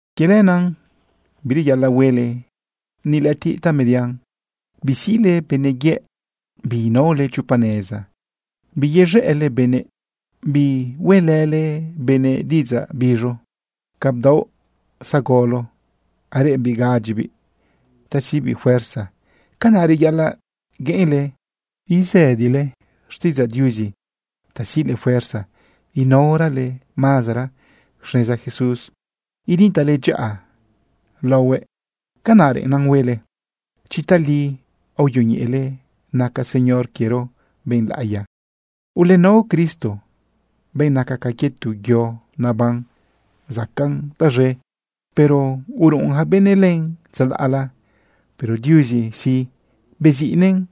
Quie lenaꞌ bireyaꞌalaꞌ huele ni lëꞌëtiꞌ tamedian. Bisiꞌle benëꞌ yëꞌ, biinaole chopa neza, biyez̃ëꞌle benëꞌ, bihueꞌlële benëꞌ diꞌidzaꞌ biz̃u. Ca bdaoꞌ zagolo areꞌembiꞌ gaꞌadyibiꞌ ta siꞌbiꞌ fuerza, canaꞌ reyaꞌalaꞌ gueꞌenle isëdile xtiꞌidzaꞌ Diuzi ta siꞌle fuerza inaorale mazara xneza Jesús, initaꞌle dyaꞌa laohuëꞌ. Canaꞌ reꞌennan huele chi tali aoyoñeꞌele naca Señor quiero benꞌ laꞌiya. Ulenao Cristo, benꞌ naca ca quie tu yo naban zacaꞌn taz̃e, pero uruꞌun yaca benëꞌ len tzalaꞌla. Pero Diuzi sí, beziꞌnëꞌ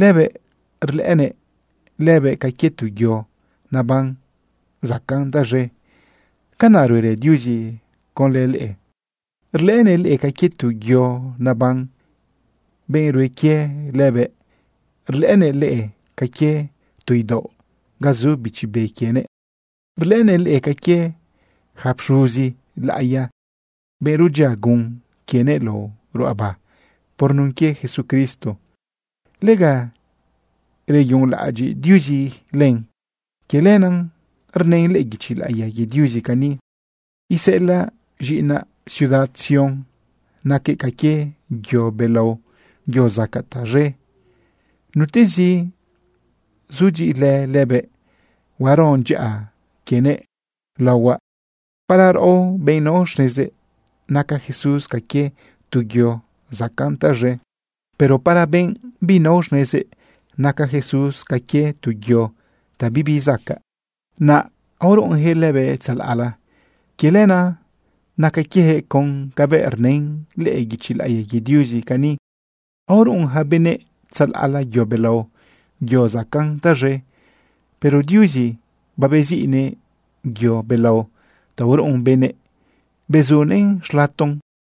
lëbëꞌ rlëꞌënëꞌ lëbëꞌ ca quie tu yo naban zacaꞌn taz̃e. Canaꞌ ruerë Diuzi conlë leꞌe. Rlëꞌënëꞌ leꞌe ca quie tu yo naban, benꞌ rue quie lëbëꞌ. Rlëꞌënëꞌ leꞌe ca quie tu idaoꞌ ga zu Bichi Be quienëꞌ. Rlëꞌënëꞌ leꞌe ca quie yaca pxuzi laꞌiya, benꞌ rudyia gun quienëꞌ lao ruꞌaba por nun quie Jesucristo, lega reyunlaꞌadyiꞌ Diuzi len. Quie lenaꞌ rnën lëꞌë guichi laꞌiya quie Diuzi cani: Iseꞌelaꞌ z̃iꞌinaꞌ ciudad Sión, naquëꞌ ca quie yo belao, yo zacaꞌ taz̃e. Nutezi sudyiꞌilë lëbëꞌ, huaron dyaꞌa quienëꞌ laohuaꞌ. Para raꞌo, benꞌ nao xnezëꞌ, naca Jesús ca quie tu yo zacaꞌn taz̃e. Pero para benꞌ binao xnezëꞌ, naca Jesús ca quie tu yo ta bibi zacaꞌ, naꞌ aoruꞌunyaquëꞌ lëbëꞌ tzalaꞌla. Quie lenaꞌ naca quieyaquëꞌ con cabëꞌ rnën lëꞌë guichi laꞌiya quie Diuzi cani: Aoruꞌun yaca benëꞌ tzalaꞌla yo belao, yo zacaꞌn taz̃e, pero Diuzi babeziꞌnëꞌ yo belao ta uruꞌun benëꞌ, bezunëꞌn xlaton.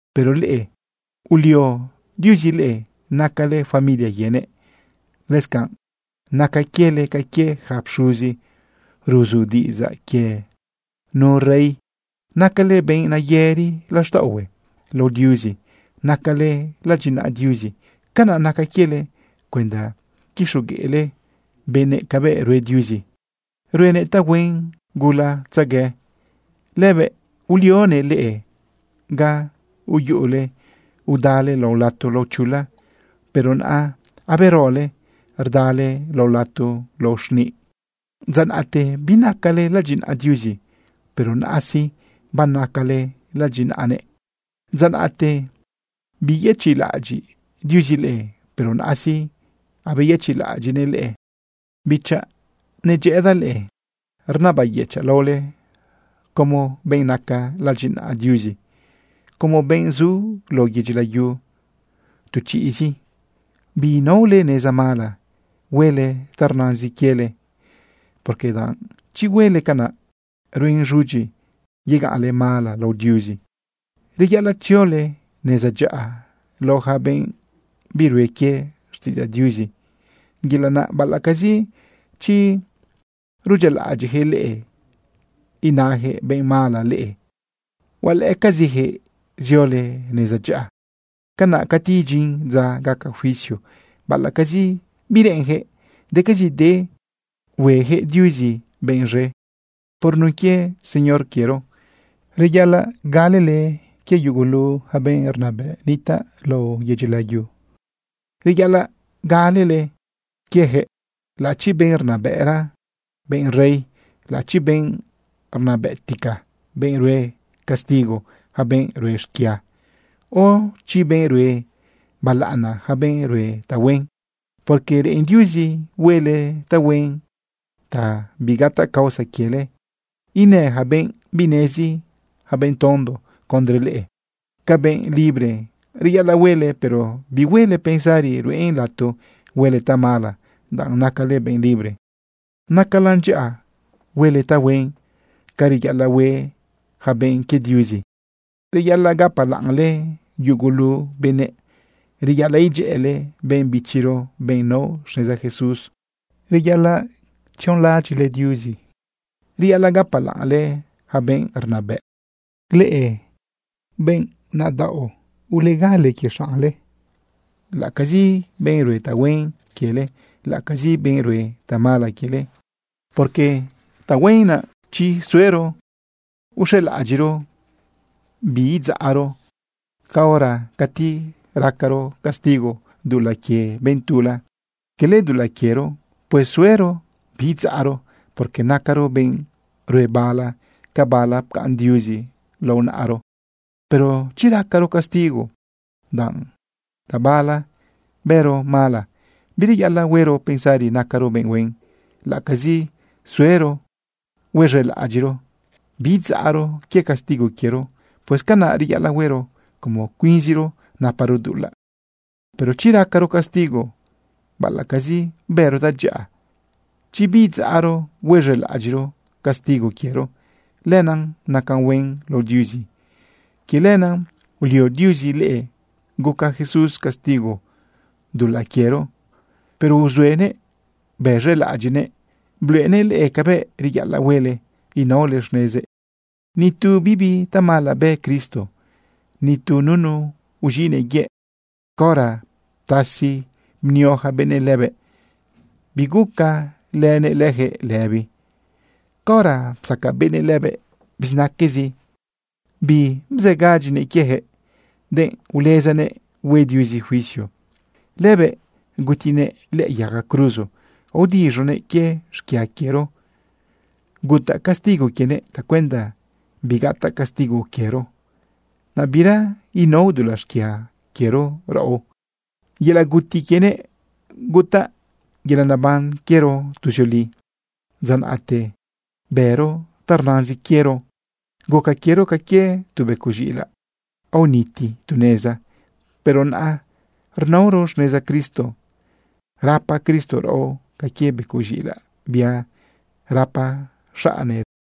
Pero leꞌe, ulio Diuzi leꞌe, nacale familia quienëꞌ. Lëscanꞌ naca quiele ca quie yaca pxuzi ruzu diꞌidzaꞌ quie nu rey. Nacale benꞌ nayëri laxtaꞌohue lao Diuzi. Nacale ladyinaꞌa Diuzi. Canaꞌ naca quiele cuenda quixogueꞌle benëꞌ cabëꞌ rue Diuzi, ruenëꞌ tahuen gulatzegue. Lëbëꞌ ulionëꞌ leꞌe ga uyuꞌule udale lao lato lao chula, pero naꞌa aberole rdale lao lato lao xniꞌ. Dza naꞌte binacale ladyinaꞌa Diuzi, pero naꞌa sí, banacale ladyinaꞌanëꞌ. Dza naꞌte biyëchiꞌlaꞌadyiꞌ Diuzi leꞌe, pero naꞌa sí, abeyechiꞌlaꞌadyiꞌnëꞌ leꞌe. Bichaꞌ, nedyëꞌëdaꞌ leꞌe, rnabayëchaꞌ laole como benꞌ naca ladyinaꞌa Diuzi, como benꞌ zu lao yedyi layu tu chiꞌzi, biinaole neza mala huele ta rnazin quiele, porque danꞌ chi huele canaꞌ, ruen z̃udyi yegaꞌnle mala lao Diuzi. Reyaꞌalaꞌ tziole neza dyaꞌa lao yaca benꞌ birue quie xtiꞌidzaꞌ Diuzi. Yelaꞌ naꞌ baꞌalaꞌcazi chi rudyialaꞌadyiꞌjëꞌ leꞌe inayaquëꞌ benꞌ mala leꞌe, hualëꞌëcazijëꞌ ziole neza dyaꞌa. Canaꞌ cati idyin dza gaca juicio, baꞌalaꞌcazi bireꞌenjëꞌ, decazide huejëꞌ Diuzi benꞌ z̃e. Por nun quie Señor quiero, reyaꞌalaꞌ galele quie yugulu ja benꞌ rnabëꞌ nitaꞌ lao yedyi layu. Reyaꞌalaꞌ galele quiejëꞌ laꞌachi benꞌ rnabëꞌra, benꞌ rey, laꞌachi benꞌ rnabëꞌtica, benꞌ rue castigo yaca benꞌ rue xquia, o chi benꞌ rue balaꞌana yaca benꞌ rue tahuen. Porque reꞌen Diuzi huele tahuen ta bigataꞌ causa quiele inë yaca benꞌ binezi, yaca benꞌ tondo, condre leꞌe. Ca benꞌ libre reyaꞌalaꞌ huele, pero bihuele pensari ruꞌen lato huele tamala danꞌ nacale benꞌ libre. Nacalan dyaꞌa huele tahuen ca reyaꞌalaꞌ hue yaca benꞌ quie Diuzi. Reyaꞌalaꞌ gapalaꞌnle yugulu benëꞌ. Reyaꞌalaꞌ idyëꞌële benꞌ bichiro, benꞌ nao xneza Jesús. Reyaꞌalaꞌ tzionlaꞌadyiꞌle Diuzi. Reyaꞌalaꞌ gapalaꞌnle yaca benꞌ rnabëꞌ. Leꞌe benꞌ nadaꞌo, ulegale quie xaꞌnle, laꞌacazi benꞌ rue tahuen quiele, laꞌalacazi benꞌ rue tamala quiele. Porque tahuen naꞌ chi suero huez̃elaꞌadyiꞌro biidzaꞌro caora cati racaro castigo dulaꞌ quie benꞌ tula, cala dulaꞌ quiero. Pues suero biidzaꞌro, porque nacaro benꞌ rue bala ca bala pcaꞌn Diuzi lao naꞌaro. Pero chi racaro castigo, danꞌ tabala bëro mala, bireyaꞌalaꞌ huero pensari nacaro benꞌ huen, laꞌacazi suero huez̃elaꞌadyiꞌro biidzaꞌro quie castigo quiero. Pues canaꞌ reyaꞌalaꞌ huero como cuinziro naparo dulaꞌ. Pero chi racaro castigo baꞌalaꞌcazi bëro tadyaꞌa, chi bidzaꞌro huez̃elaꞌadyiꞌro castigo quiero, lenaꞌ nacan huen lao Diuzi. Quie lenaꞌ ulio Diuzi leꞌe guca Jesús castigo dulaꞌ quiero, pero uzuenëꞌ bez̃elaꞌadyiꞌnëꞌ bluꞌenëꞌ leꞌe cabëꞌ reyaꞌalaꞌ huele inaole xnezëꞌ. Ni tu bibi tamala bë Cristo, ni tu nunu uz̃iꞌnëꞌ yëꞌ. Caora ptasi bnio yaca benëꞌ lëbëꞌ, biguca lënëꞌ leyaquëꞌ lëbi. Caora psaca benëꞌ lëbëꞌ bizinaquezi, bibzëgadyinëꞌ quieyaquëꞌ, denꞌ ulezanëꞌ hue Diuzi juicio. Lëbëꞌ gutinëꞌ lëꞌë yaga cruzo aodiz̃uguëꞌ quie xquia quiero. Gutaꞌ castigo quienëꞌ tacuenda bigataꞌ castigo quiero, naꞌ bira inao dulaꞌ xquia quiero raꞌo. Yelaꞌ guti quienëꞌ gutaꞌ yelaꞌ naban quiero tuzioli. Dza naꞌte bëro ta rnazin quiero, guca quiero ca quie tu becoꞌ z̃iꞌilaꞌ aoniti tu neza. Pero naꞌa rnaoro xneza Cristo. Rapa Cristo raꞌo ca quie becoꞌ z̃iꞌilaꞌ bia rapa xaꞌne lëbaꞌ.